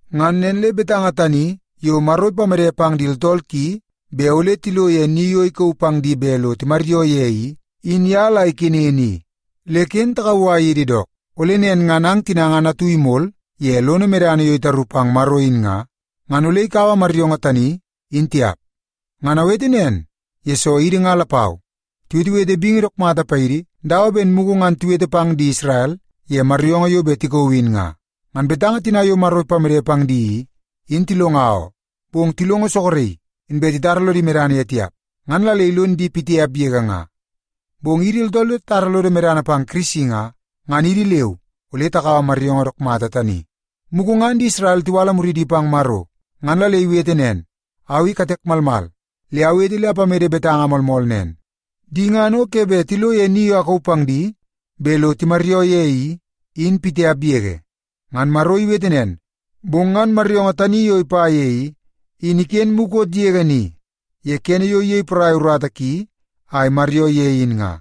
Ngan nen le betanga tani yo Maro ipamede pang di tooltool ki bet ole tilo ye ni yo ikauu pang di bet lo timaryoo ye i, in ye la ikenen i. Le ken takauwai yidi dook, ole nen ngan ang tina ngan atu imol ye lono medana yo itaru pang Maro in nga, ngan ole ikaua maryoongoo tani, in tiap. Ngan awete nen, yesoo idi nga lapau, tiwetewete bingi dook mata paidi dawa ben mugu ngan tiwete pang di Isrel ye maryoongoo yo bet tikauu in nga. Ngan betanga tina yo Maro ipamede pang di i, in tilonga oo, bong tilongo soroki, inbe titara lodi medana ye tiap, ngan la le ilon di pitiap yege nga. Bong idi tooltool yo tatara lodo medana pang Kirisi nga, ngan idi leu ole takaua maryoongoo dook mata tani. Mugu ngan di Isrel tiwala muridi pang Maro, ngan la le iwete nen, “Au i katek malmal le awete le apamede betanga moolmool nen, ‘Di ngan o ke bet tilo ye ni yo akauu pang di bet lo timaryoo ye i, in pitiap yege.’” Ngan Maro iwete nen, bong ngan maryoongoo tani yo ipa ye i, in iken mukot yege ni ye kene yo iyei porai urata ki a imaryoo ye in nga.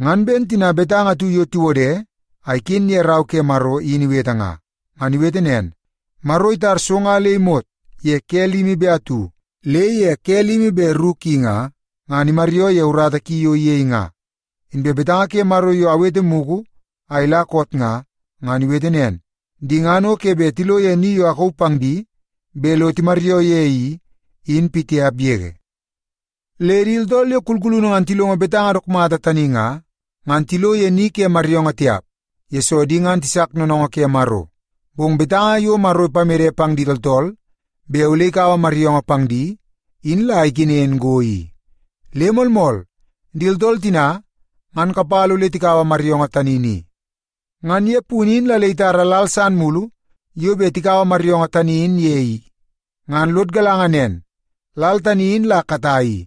Ngan ben tina betanga atu yo tiwode a iken ye Rau ke Maro in iwete nga, “Maro itar so nga le imot ye ke limi be atu, le ye ke limi be ru ki nga, ngan imaryoo ye urata ki yo iyei nga.” Inbe betanga ke Maro yo awete mugu a ila koot nga, ngan iwete nen, “Di ngan o ke bet tilo ye ni yo akauu pang di bet lo timaryoo ye i, in pitiap yege.” Le di tooltool yo kulkulunu ngan tilongo betanga dook mata tani nga, ngan tilo ye ni ke maryoongoo tiap, yesoo di ngan tisak noonoongoo ke Maro. Bong betanga yo Maro ipamede pang di tooltool bet ole ikaua maryoongoo pang di, in la ikenen go i, le moolmool, di tooltool tina ngan kapala ole tikaua maryoongoo tani ni. Ngan ye punu in la le itara lal san mulu yo bet takaua maryoongoo tani in ye i. Ngan lod galanga nen lal tani in la katai i,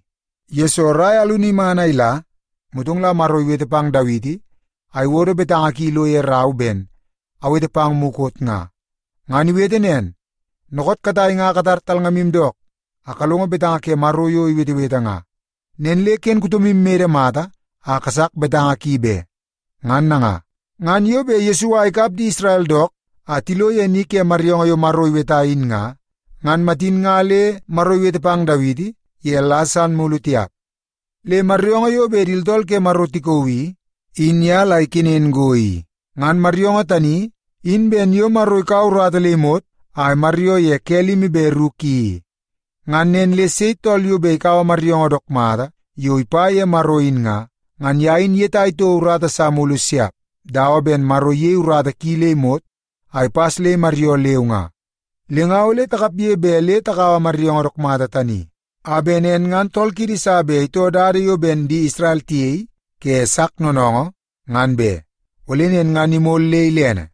yesoo rai alunu iman a ila, motong la Maro iwete pang Dawiti a iwodo betanga ki ilo ye rau ben awete pang mugu koot nga. Ngan iwete nen, “Dookoot katai nga katar talngamu dook, a kalongo betanga ke Maro yo iwetewete nga. Nen le ken kutomu imede mata a kasak betanga ki be.” Ngan nanga, ngan yo bet Yesua ikap di Isrel dook a tilo ye ni ke maryoongoo yo Maro iweta in nga, ngan matin nga le Maro iwete pang Dawiti ye lal san mulu tiap. Le maryoongoo yo bet di tooltool ke Maro tikauu i, in ye la ikenen go i. Ngan maryoongoo tani in ben yo Maro ikaua urata le imot a imaryoo ye ke limi be ru ki i. Ngan nen le sei tool yo bet ikaua maryoongoo dook mata yo ipa ye Maro in nga, ngan ye in iyetai toko urata sa mulu siap, dawa ben Maro iyei urata ki le imot a ipas le imaryoo leu nga. Le nga ole takapge bet le takaua maryoongoo dook mata tani, a bet nen ngan tool kiidi sa bet itoo dada yo ben di Isrel tiyei ke sak noonoongoo, ngan be. Ole nen ngan imol le ilene.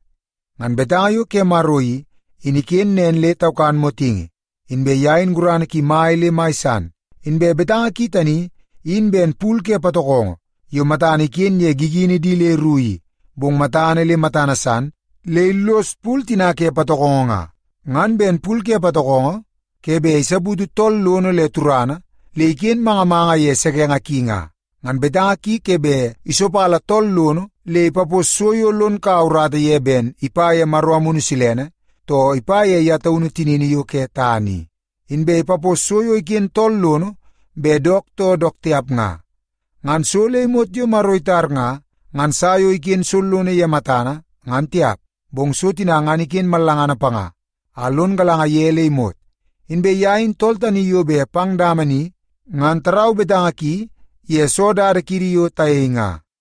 Ngan betanga yo ke Maro i, in iken nen le taukan motingi, inbe ye in gurana ki mai le mai san. Inbe betanga ki tani in ben pul ke patokongo yo matana iken ye gigini di le ru i, bong matana le matana san le illos pul tina ke patokongo nga. Ngan ben pul ke patokongo ke bet isaputu tool soonoo le turana le iken manga manga ye sekenge ki nga, ngan betanga ki ke bet isopala tool lono le ipapos so yo lon kaua urata ye ben ipa ye Maro Amunu Silene, too ipa ye ye taunu tinini yo ke tana i. Inbe ipapos so yo iken tool lono bet dook too dook tiap nga. Ngan so le imot yo Maro itar nga, ngan sa yo iken sollono ye matana, ngan tiap, bong so tina ngan iken mallangana panga a lon galanga ye le imot. Inbe ye in tool tani yo bet pang dama ni ngan tarau betanga ki ye soo dada kiidi yo tayei nga.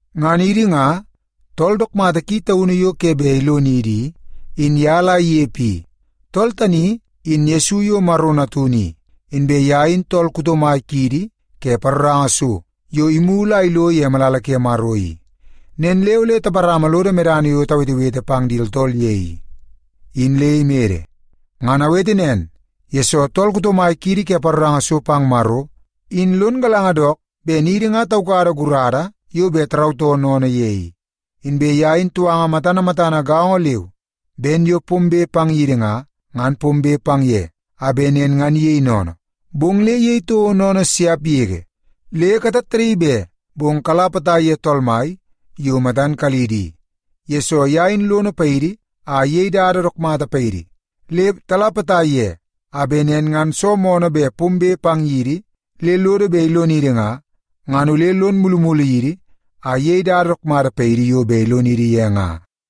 Ngan idi nga, tool dook mata ki taunu yo ke bet ilonidi i, in ye la inepe i. Tool tani in Yesu yo Maro Natunu i, inbe ye in tool kuto mai kiidi ke paroranga so yo imulu a ilo ye malala ke Maro i. Nen le ole taparama lodo medana yo tawetewete pang di tooltool ye i, in le imede. Ngan awete nen, yesoo tool kuto mai kiidi ke paroranga so pang Maro, in lon galanga dook ben idi nga taukada gurada yo bet tarautoo sennene ye i. Inbe ye in touanga matana matana gaongo leu ben yo pombe pang yidi nga, ngan pombe pang ye a bet nen ngan iyei sennene, bong le iyei toko sennene siap yege. Le katattadaii be, bong kala potai ye Tool Mai yo matan kalidi i, yesoo ye in lono paidi a iyei dada dook mata paidi. Le tala potai ye a bet nen ngan soo moonoo bet pombe pang yidi le lodo bet ilonidi nga, ngan ole lon mulumulu yidi a iyei dada dook mata paidi yo bet ilonidi ye nga.